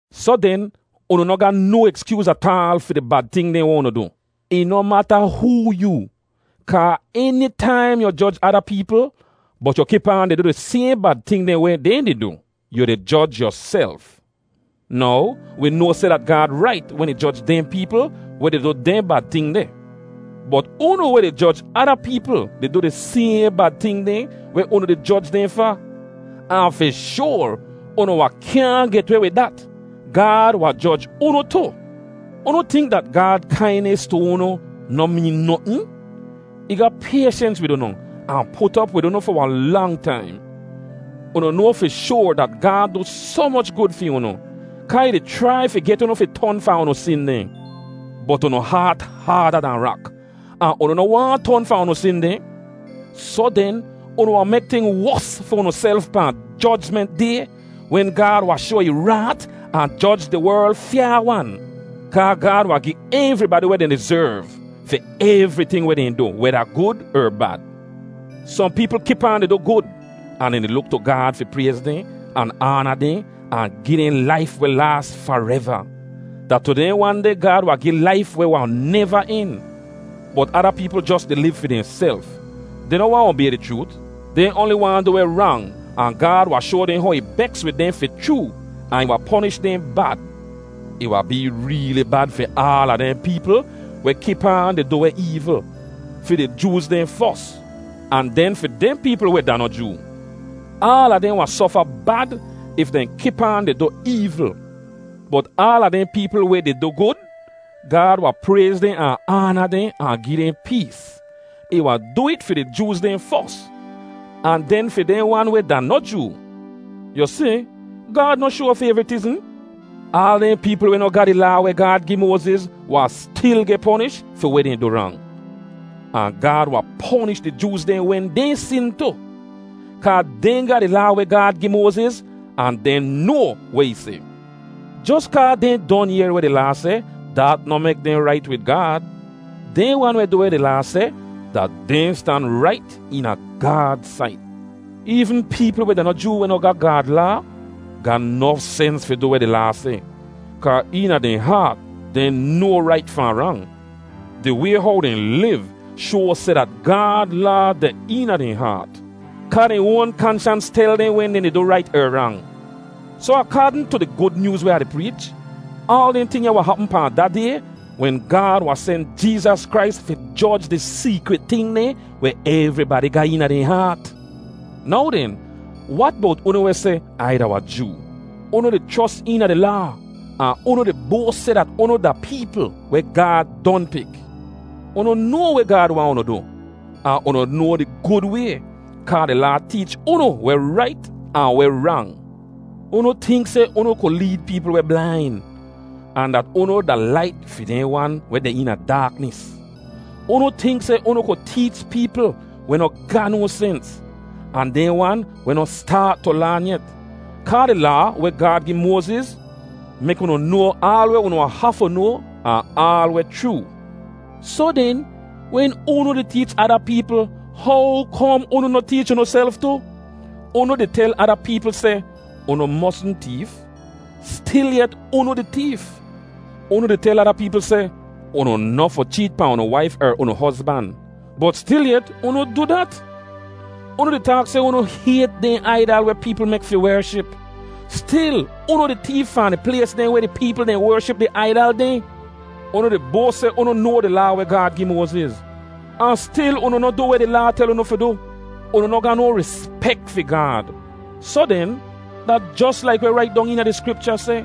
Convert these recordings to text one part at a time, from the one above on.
Soh den, unu noh ga no ekskyooz ataal fi di bad ting dehn weh unu du. Ih noh mata hoo yoo, kaa enitaim yu joj ada peepl, bot yu kip aan di du di sayhn bad ting dehn weh dehn di du, yu di joj yuself. Now, wi noa seh dat Gaad rait wen ih joj dehn peepl weh di du dehn bad ting deh. Bot unu weh di joj ada peepl di du di sayhn bad ting dehn weh unu di joj dehn fa. Ahn fi shoar unu wahn kyaahn get weh wid dat. Gaad wahn joj unu tu. Unu tink dat Gaad kainis tu unu noh meen notn? Ih ga payshens wid unu ahn put op wid unu fi wahn lang taim. Unu noa fi shoar dat Gaad du soh moch gud fi unu, kaa ih di chrai fi get unu fi ton fahn unu sin dehn. Bot unu haat haada dahn rak, ahn unu noh waahn ton fahn unu sin dehn. Soh den, unu wahn mek ting wos fi unuself pahn Jojment Day wen Gaad wahn shoa ih raat ahn joj di werl fyaa-wan. Kaa Gaad “wahn gi evribadi weh dehn dizerv fi evriting weh dehn du, weda gud er bad.” Sohn peepl kip aan di du gud ahn dehn di luk tu Gaad fi prayz dehn ahn aana dehn ahn gi dehn laif weh laas fareva; da tu dehn wan deh Gaad wahn gi laif weh wahn neva en. Bot ada peepl jos di liv fi dehnself. Dehn noh waahn obay di chroot; dehn oanli waahn du weh rang, ahn Gaad wahn shoa dehn how ih beks wid dehn fi chroo, ahn ih wahn ponish dehn bad. Ih wahn bee reeli bad fi aala dehn peepl weh kip aan di du weh eevl, fi di Jooz dehn fos, ahn den fi dehn peepl weh da noh Joo. Aala dehn wahn sofa bad if dehn kip aan di du eevl. Bot aala dehn peepl weh di du gud, Gaad wahn prayz dehn ahn aana dehn ahn gi dehn pees. Ih wahn du it fi di Jooz dehn fos, ahn den fi dehn wan weh da noh Joo. Yu si, Gaad noh shoa fayvritizm. Aal dehn peepl weh noh ga di Laa weh Gaad gi Moaziz wahn stil geh ponish fi weh dehn du rang. Ahn Gaad wahn ponish di Jooz dehn wen dehn sin tu, kaa dehn ga di Laa weh Gaad gi Moaziz ahn dehn noa weh ih seh. Jos kaa dehn don yehr weh di Laa seh, dat noh mek dehn rait wid Gaad. Dehn wan weh du weh di Laa seh, da dehn stan rait eena Gaad sait. Eevn peepl weh da noh Joo weh noh ga Gaad Laa, ga nof sens fi du weh di Laa seh, kaa eena dehn haat dehn noa rait fahn rang. Di way how dehn liv shoa seh dat Gaad Laa deh eena dehn haat, kaa dehn oan kanshans tel dehn wen dehn di du rait er rang. Soh akaadn tu di Gud Nyooz weh Ah di preech, aal dehn ting ya wahn hapm pahn da Day wen Gaad wahn sen Jeezas Krais fi joj di seekrit ting dehn weh evribadi ga eena dehn haat. Now den, wat bowt unu weh seh, “Ai da wahn Joo?” Unu di chros eena di Laa, ahn unu di boas seh dat unu da peepl weh Gaad don pik. Unu noa weh Gaad waahn unu du, ahn unu noa di gud way, kaa di Laa teech unu weh rait, ahn weh rang. Unu tink seh unu ku leed peepl weh blain, ahn dat unu da lait fi dehn wan weh deh eena daaknis. Unu tink seh unu ku teech peepl weh noh ga no sens, ahn dehn wan weh noh staat tu laan yet, kaa di Laa weh Gaad gi Moaziz mek unu noa aal weh unu wahn hafu noa, ahn aal weh chroo. Soh den, wen unu di teech ada peepl, how kom unu noh teech unuself tu? Unu di tel ada peepl seh, “Unu mosn teef.” Stilyet, unu di teef! Unu di tel ada peepl seh, “Unu noh fi cheet pahn unu waif er unu hozban,” bot stilyet unu du dat. Unu di taak seh unu hayt dehn aidal weh peepl mek fi wership. Stil, unu di teef fahn di plays dehn weh di peepl dehn wership di aidal dehn. Unu di boas seh unu noa di Laa weh Gaad gi Moaziz, ahn stil unu noh du weh di Laa tel unu fi du. Unu noh ga no rispek fi Gaad. Soh den, da jos laik weh rait dong eena di Skripcha seh,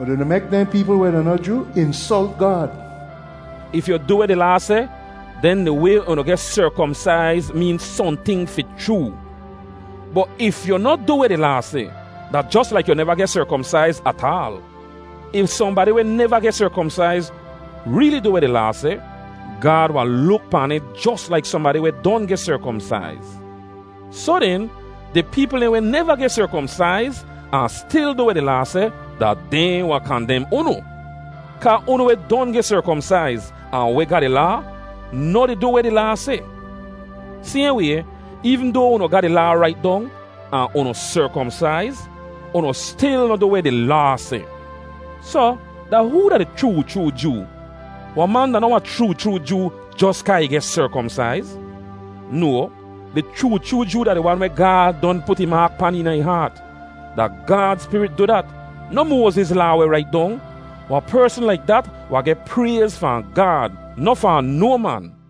“Unu di mek dehn peepl weh da noh Joo insolt Gaad.” If yu du weh di Laa seh, den di way unu geh serkomsaiz meen sohnting fi chroo. Bot if yu noh du weh di Laa seh, da jos laik yu neva geh serkomsaiz ataal. If sohnbadi weh neva geh serkomsaiz reeli du weh di Laa seh, Gaad wahn luk pahn dehn jos laik sohnbadi weh don geh serkomsaiz. Soh den, di peepl dehn weh neva geh serkomsaiz ahn stil du weh di Laa seh, da dehn wahn kandem unu. Kaa unu weh don geh serkomsaiz, ahn weh ga di Laa, noh di du weh di Laa seh. Sayhn way, eevn doa unu ga di Laa rait dong, ahn unu serkomsaiz, unu stil noh du weh di Laa seh. Soh da hoo da di chroo chroo Joo? Wahn man da noh wahn chroo chroo Joo jos kaa ih geh serkomsaiz. No. Di chroo chroo Joo da di wan weh Gaad don put ih maak pan eena ih haat. Da Gaad Spirit du dat, noh Moaziz Laa weh rait dong. Wahn persn laik dat wahn geh prayz fahn Gaad, noh fahn no man.